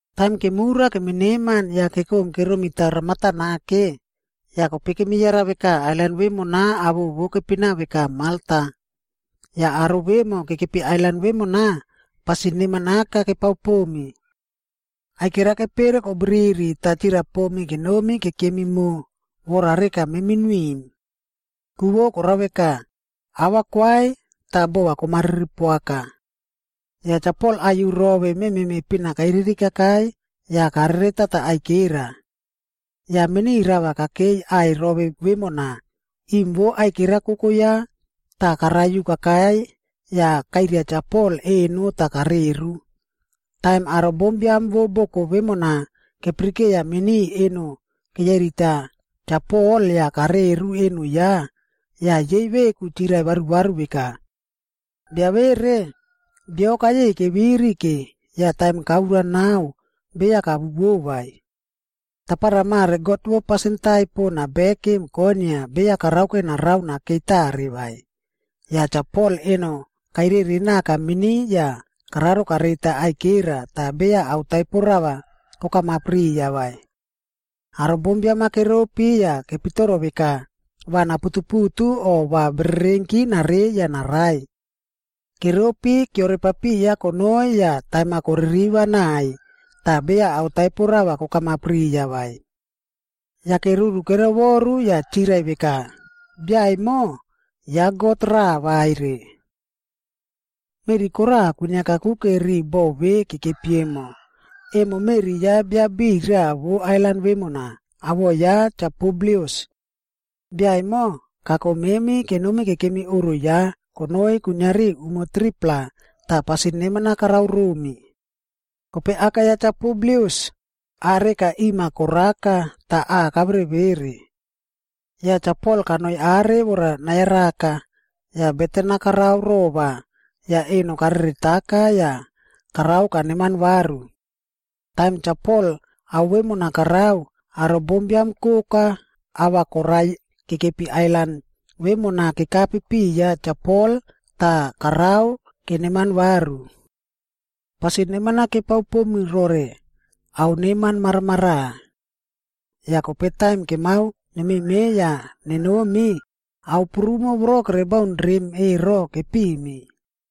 Taim kemura kemineman yah kekom keromitao ramata nake, yah kope kemiyara veka ailan vemona awoꞌo vo kepina veka Malta. Yah aro vemo kekepi ailan vemona, pasin neman aka kepao pomi. Aikera kepere kobriri tah chirai pomi kenomi kekemi mo vora reka memi nuiꞌim. Ku vo korao veka, ava kwai tah bova komariri poaka. Yah Cha Pol aiyu rove mememe pina kairiri kakai yah kareretata aikera. Yah mini rava kakei aꞌai rove vemona, iꞌim vo aikera koko ya tah karaiyu kakai yah kaiꞌria Cha Pol eno tah kareru. Taim aro bombiam vo boko vemona kepirikeiya mini eno keyairita Cha Pol yah kareru eno ya, yah yei veku chirai varuvaru veka, “Bia vere, bio kayei keviri ke, yah taim kaura nao beya kawuwo vai. Tapara mare god vo pasin taipo nabekim konia beya karaoke narao nakei natare vai.” Yah Cha Pol eno kairere naka mini yah kararo kareita aikera tah beya ao taipo rava kokamap riya vai. Aro bombiam-a keropi yah kepitoro veka va naputuputu o va bererenki narei yah narai. Keropi kiorepapiya konoi yah taim-a koririva naiy tah beya ao taipo rava kokamap riya vai. Yake, ruru kerovoru yah chirai veka, “Bia emo, ya god raꞌa vaire.” Meꞌri kora kwiniaka kakuke ri boꞌo ve kekepi emo, emo meꞌri ya bia biꞌiy raꞌa vo ailan vemona, awoꞌo ya Cha Publius. Bia emo, kako memi kenomi kekemi oꞌro ya konoi kuiniari umo 3-pla tah pasin neman-a karao romi. Kope aka ya Cha Publius ah reka iꞌim-a koraka tah aꞌa kaverevere. Yah Cha Pol kanoi are vora nayaraka, yah beten-a karao rova yah eno kareretaka yah karao kaneman varu. Taim Cha Pol ao vemona karao, aro bombiam koka ah va koraiy kekepi ailan vemona kekape piya Cha Pol tah karao keneman varu. Pasin neman-a kepao pomi rore ao neman maramaraꞌa. Yah kope taim kemao nememeiy yah nenomi, ao prumo voro kerebaun rem ero, kepimi.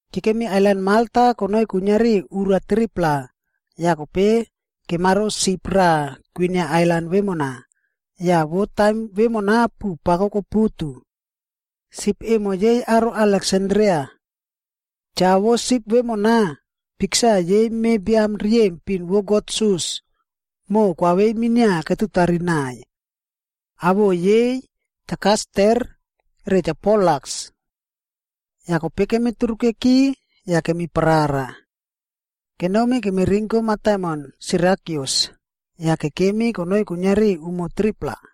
Kekemi ailan Malta konoi kuiniari ura 3-pla, yah kope kemaro sip raꞌa kwinia ailan vemona, yah vo taim vemona puꞌu pako koputu. Sip emo yei aro Aleksandria. Cha vo sip vemona, piksa yei me biam riyempin vo god Sus, moꞌo koaveiy minia ketutari naꞌaiy. Awoꞌo yei Cha Kaster re Cha Polaks. Yah kope kemi turukeki yah kemiparara. Kenomi kemirinko mataimon Sirakyus yah kekemi konoi kuiniari umo 3-pla.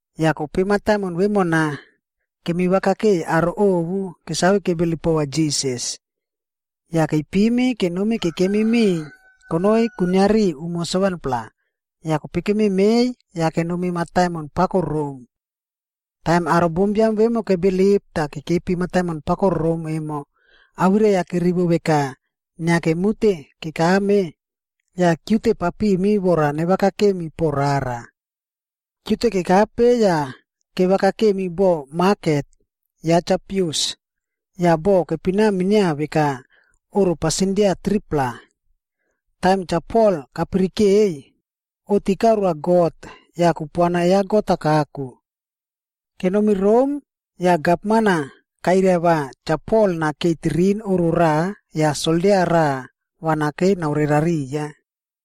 Yah kope mataimon vemona, kemivakakeiy aro ovu kesave kebilip pova Jisas. Yah keipimi kenomi kekemi miꞌiy konoi kuiniari umo 7-pla, yah kope kememeiy yah kenomi mataimon pako Rom. Taim aro bombiam vemo kebilip tah kekepi mataimon pako Rom emo awirai-a kerivo veka inia kemute kekame, yah kiute papimi vora nevakakemi po rara. Kiute kekape yah kevaka kemi boꞌo maket ya Cha Apius, yah boꞌo kepina minia veka Oꞌro Pasindia Tripla. Taim Cha Pol kapirikeiy, oꞌti karoa God yah kupuana ya God-a kako. Kenomi Rom yah gavman-a kairai va Cha Pol nakei tirin oꞌro raꞌa yah soldia raꞌa va nakei naore rariya.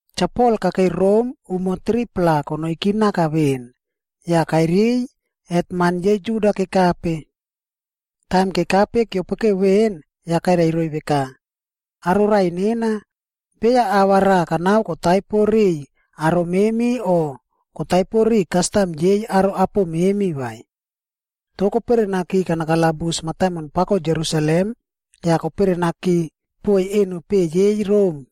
Cha Pol kakei Rom umo 3-pla konoiki naka veꞌen, yah kairiy hetman yei Juda kekape. Taim kekape kiopokeu veꞌen, yah kairai roiy veka, “Aro raꞌai nena, beya ava raꞌa kanao kotaipo riꞌiy aro memi o kotaipo ri kastam yei aro apo memi vai. Toh keperenaki kanakalabus mataimon pako Jerusalem yah keperenaki poiy eno peꞌe yei Rom.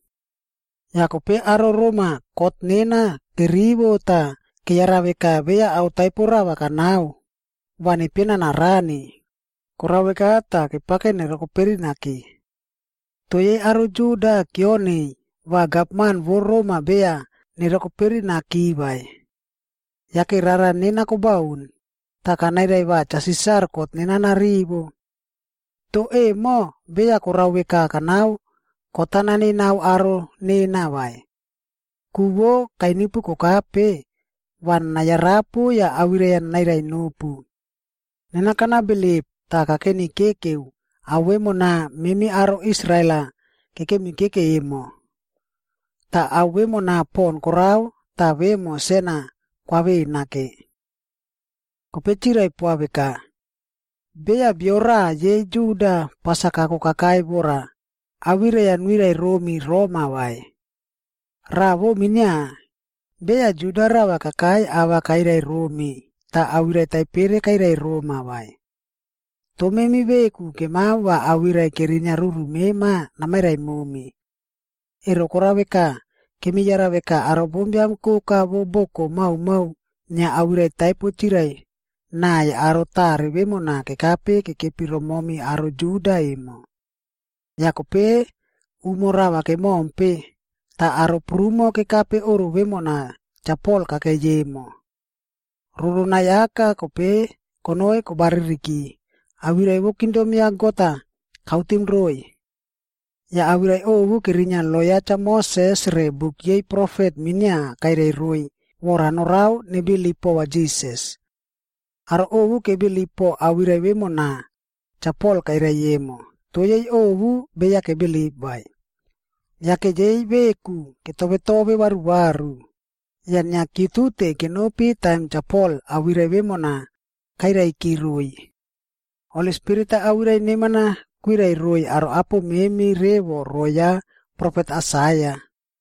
Yah kope aro Rom-a kot nena kerivo tah keyara veka beya ao taipo rava kanao, va nepiena narani, korao veka tah kepake nerokoperinaki. “Toh yei aro Juda kioniy va gavman vo Rom-a beya nerokoperinaki vai. Yake rara nena kobaun, tah kanairai va Cha Sisar kot nena narivo. Toh emo beya korao veka kanao kot-a nanenao aro nena vai. Ku vo kainipu kokape, va nanayarapu yah awirai-a nanairai nopu. Nena kanabilip tah kakenikekeu ao vemona memi aro Israel-a kekemikekeu emo. Tah ao vemona pon korao tah vemo sen-a kwavena ke.” Kope chirai poa veka, “Beya bio raꞌa yei Judia pas-a kako kakai vora awirai-a nuirai romi roma vai. Raꞌa vo minia, beya Juda rava kakai ava kairai romi tah awirai taipere kairai roma vai. Toh memi veku kemao va awirai kerinia ruru mema namairai momi. Ero korao veka, kemi yara veka aro bombiam koka vo boko maomao inia awirai taipo chirai naꞌai aro tare vemona kekape kekepi romomi aro Juda emo.” Yah kope umo rava kemompe, tah aro prumo kekape oꞌro vemona Cha Pol kakei emo. Roronai aka kope konoi kobaririki, awirai vo kingdom ya God-a kautim roiy. Yah awirai ovu kerinia lo ya Cha Moses re buk yei profet minia kairai roiy vora narao nebilip pova Jisas. Aro ovu kebilip po awirai vemona Cha Pol kairai emo, toh yei ovu beya kebilip vai. Yake yei veku ketove tove varuvaru, yah inia kiutute kenopi taim Cha Pol awirai vemona kairaiki roiy, “Holi Spirit-a awirai neman-a kwirai roiy aro apo memi revo roꞌo ya profet Aisaia.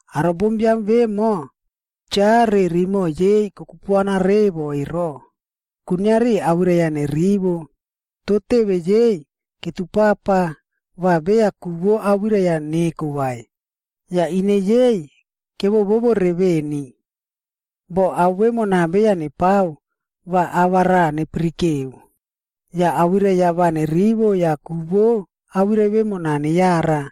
Aro bombiam vemo, cha re rimoꞌo yei kokupuana revo ero, kuiniari awirai-a nerivo,a toh teve yei ketupapa va beya ku vo awirai-a neko vai, yah ine yei kevovore veni. Boh ao vemona beya nepao, va ava raꞌa nepirikeu, yah awirai-a va nerivo yah ku vo awirai vemona neyara,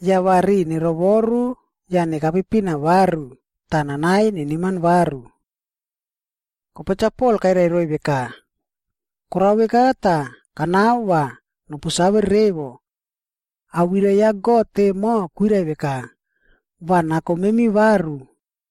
yah va riꞌi nerovoru yah nekape pina varu tah nanaiy neneman varu.’” Kope Cha Pol kairai roiy veka, “Korao veka tah, kanao va nopu save revo. Awirai ya God emo kwirai veka, va nako memi varu.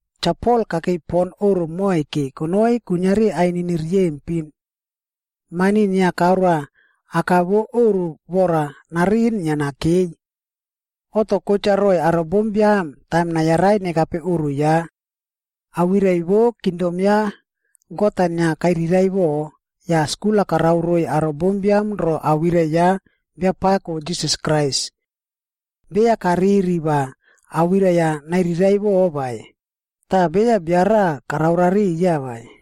Cha Pol kakei pon oꞌro moike konoi kuiniari ainini riyempinc. Mani inia karoa aka vo oꞌro vora nariꞌin inia nakei. Oꞌto kotcha roꞌoiy aro bombiam taim nayarai nekape oꞌro ya. Awirai vo kingdom ya God-a inia kairiraiꞌvo, yah skul-a karao roiy aro bombiam ro awirai ya Biapako Jisas Krais. Beya kariri va awirai-a nairiraiꞌvo vai, tah beya bia raꞌa karao rariya vai.